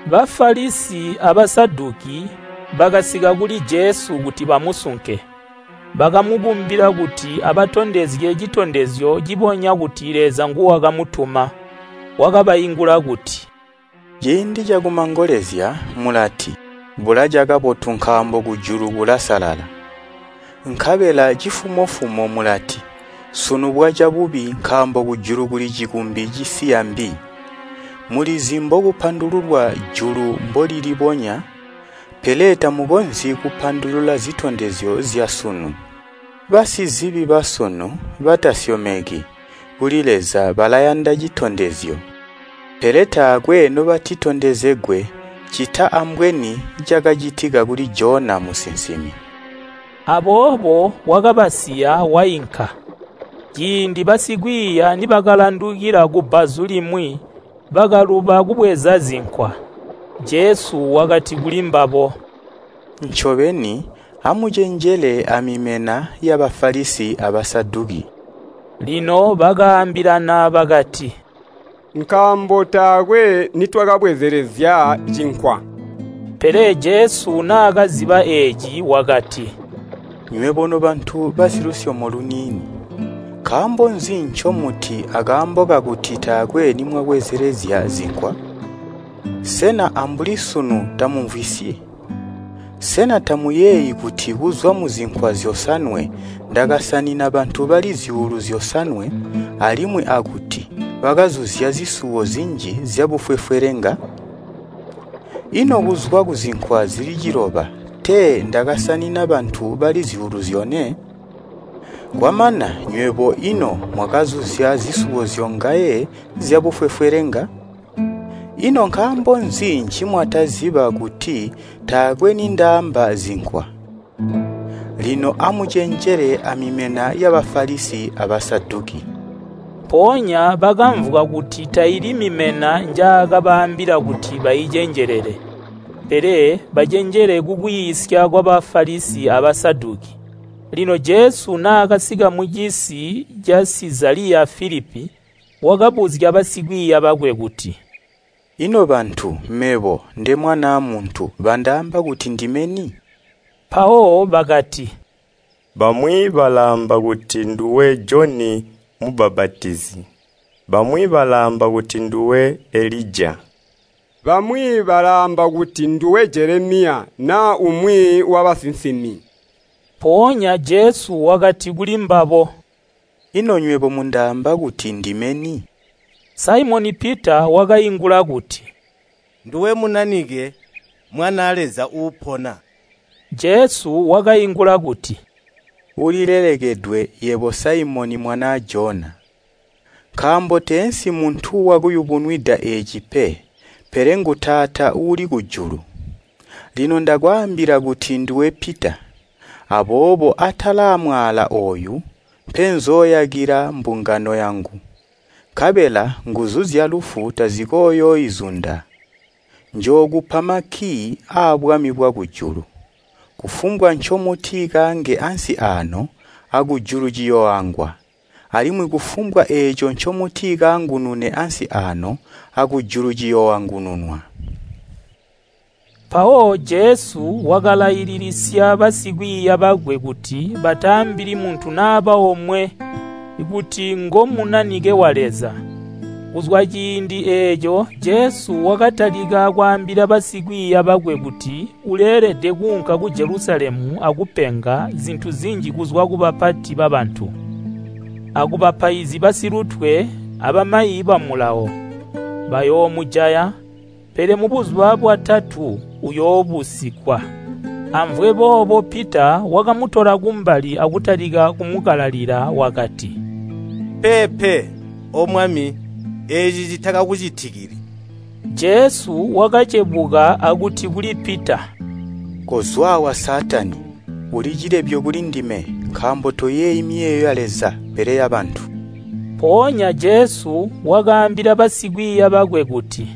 Bafalisi a Basaduki bakasika kuli Jesu kuti bamusunke. Bakamukumbila kuti abatondezye citondezyo cibonya kuti Leza nguwakamutuma. Wakabaingula kuti, “Ciindi cakumangolezya mulati, ‘Bulaca kabotu nkaambo kujulu kulasalala.’ Nkabela cifumo-fumo mulati, ‘Sunu bwaca bubi nkaambo kujulu kuli cikumbi cisiya mbi.’ Mulizi mbokupandululwa julu mbolilibonya, pele tamukonzyi kupandulula zitondezyo zyasunu. Basizibi basunu batasyomeki kuli Leza balayanda citondezyo, pele taakwe nobatitondezegwe ccita ambweni cakacitika kuli Jona musinsimi.” Aboobo wakabasiya wainka. Ciindi basikwiiya nibakalandukila kubbazu limwi, bakaluba kubweza zinkwa. Jesu wakati kulimbabo, “Ncobeni amucenjele amimena ya Bafalisi a Basaduki.” Lino bakaambilana bakati, “Nkaambo taakwe nitwabwezelezya cinkwa.” Pele Jesu naakaciziba eeci wakati, “Nywebo nobantu basilusyomo luniini! Nkaambo nzi ncomuti akaambo kakuti taakwe nimwabwezelezya zinkwa? Sena ambuli sunu tamumvwisyi? Sena tamuyeeyi kuti kuzwa muzinkwa zyosanwe ndakasanina bantu bali zyuulu zyosanwe alimwi akuti bakazuzya zisuwo zinji zyabufwefwelenga? Ino kuzwa kuzinkwa zili ciloba tee ndakasanina bantu bali zyuulu zyone? Kwamana nywebo ino mwakazuzya zisuwo zyongaye zyabufwefwelenga? Ino nkaambo nzi ncimwataziba kuti taakwe nindaamba zinkwa? Lino amucenjele amimena ya Bafalisi a Basaduki.” Mpoonya bakamvwa kuti taili mimena njaakabaambila kuti baicenjelele, pele bacenjele kukwiisya kwa Bafalisi a Basaduki. Lino Jesu naakasika mucisi ca Sizaliya Filipi, wakabuzya basikwiiya bakwe kuti, “Ino bantu mebo nde Mwanaa Muntu bandaamba kuti ndime ni?” Mpawo bakati, “Bamwi balaamba kuti nduwe Joni Mubbapatizi. Bamwi balaamba kuti nduwe Elija. Bamwi balaamba kuti nduwe Jelemiya naa umwi wabasinsimi.” Mpoonya Jesu wakati kulimbabo, “Ino nywebo mundaamba kuti ndime ni?” Saimoni Pita wakaingula kuti, “Nduwe Munanike, Mwanaa Leza Uupona.” Jesu wakaingula kuti, “Ulilelekedwe yebo Saimoni mwanaa Jona! Nkaambo teensi muntu wakuyubunwida eeci pe, pele ngu Taata uuli kujulu. Lino ndakwaambila kuti nduwe Pita, aboobo atala amwaala ooyu mpenzooyakila mbungano yangu, nkabela nguzu zyalufu tazikooyooizunda. Njookupa makkii aabwami bwakujulu, kufumbwa ncomutikaange ansi aano akuluju ciyooangwa, alimwi kufumbwa eeco ncemutikaangunune ansi aano akujulu ciyooangununwa.” Mpawo Jesu wakalaililisya basikwiiya bakwe kuti bataambili muntu naba omwe kuti ngo Munanike wa Leza. Kuzwa ciindi eeco Jesu wakatalika kwaambila basikwiiya bakwe kuti uleelede kuunka ku Jelusalemu akupenga zintu zinji kuzwa kubapati babantu, akubapaizi basilutwe abamayi ba Mulawo. Bayoomujaya, pele mubuzuba bwatatu uyoobusigwa. Amvwe boobo Pita wakamutola kumbali akutalika kumukalalila wakati, “Peepe, O Mwami! Eeci citakakucitikili!” Jesu wakacebuka akuti kuli Pita, “Kozwa aawa Saatani. Uli cilebyo kuli ndime, nkaambo toyeeyi miyeeyo ya Leza, pele yabantu.” Mpoonya Jesu wakaambila basikwiiya bakwe kuti,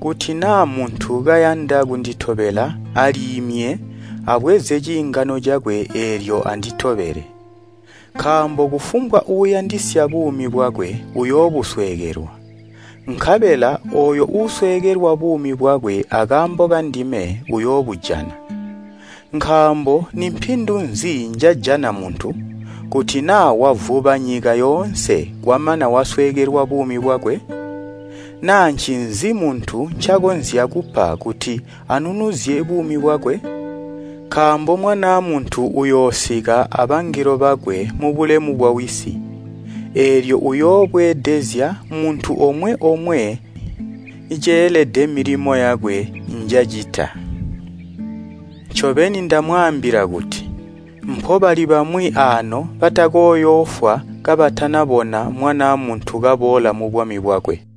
“Kuti naa muntu kayanda kunditobela aliimye abweze ciingano cakwe eelyo anditobele. Nkaambo kufumbwa uuyandisya buumi bwakwe uyoobusweekelwa, nkabela ooyo uusweekelwa buumi bwakwe akaambo kandime uyoobujana. Nkaambo nimpindu nzi njajana muntu, kuti naa wavuba nyika yoonse kwamana wasweekelwa buumi bwakwe? Naa ncinzi muntu ncakonzya kupa kuti anunuzye buumi bwakwe? Nkaambo Mwanaa Muntu uyoosika abangelo bakwe mubulemu bwa Wisi, eelyo uyoobweedezezya muntu omwe-omwe ceelede milimo yakwe njacita. Ncobeni ndamwaambila kuti, mpobali bamwi aano batakooyoofwa kabatanabona Mwanaa Muntu kaboola mubwami bwakwe.”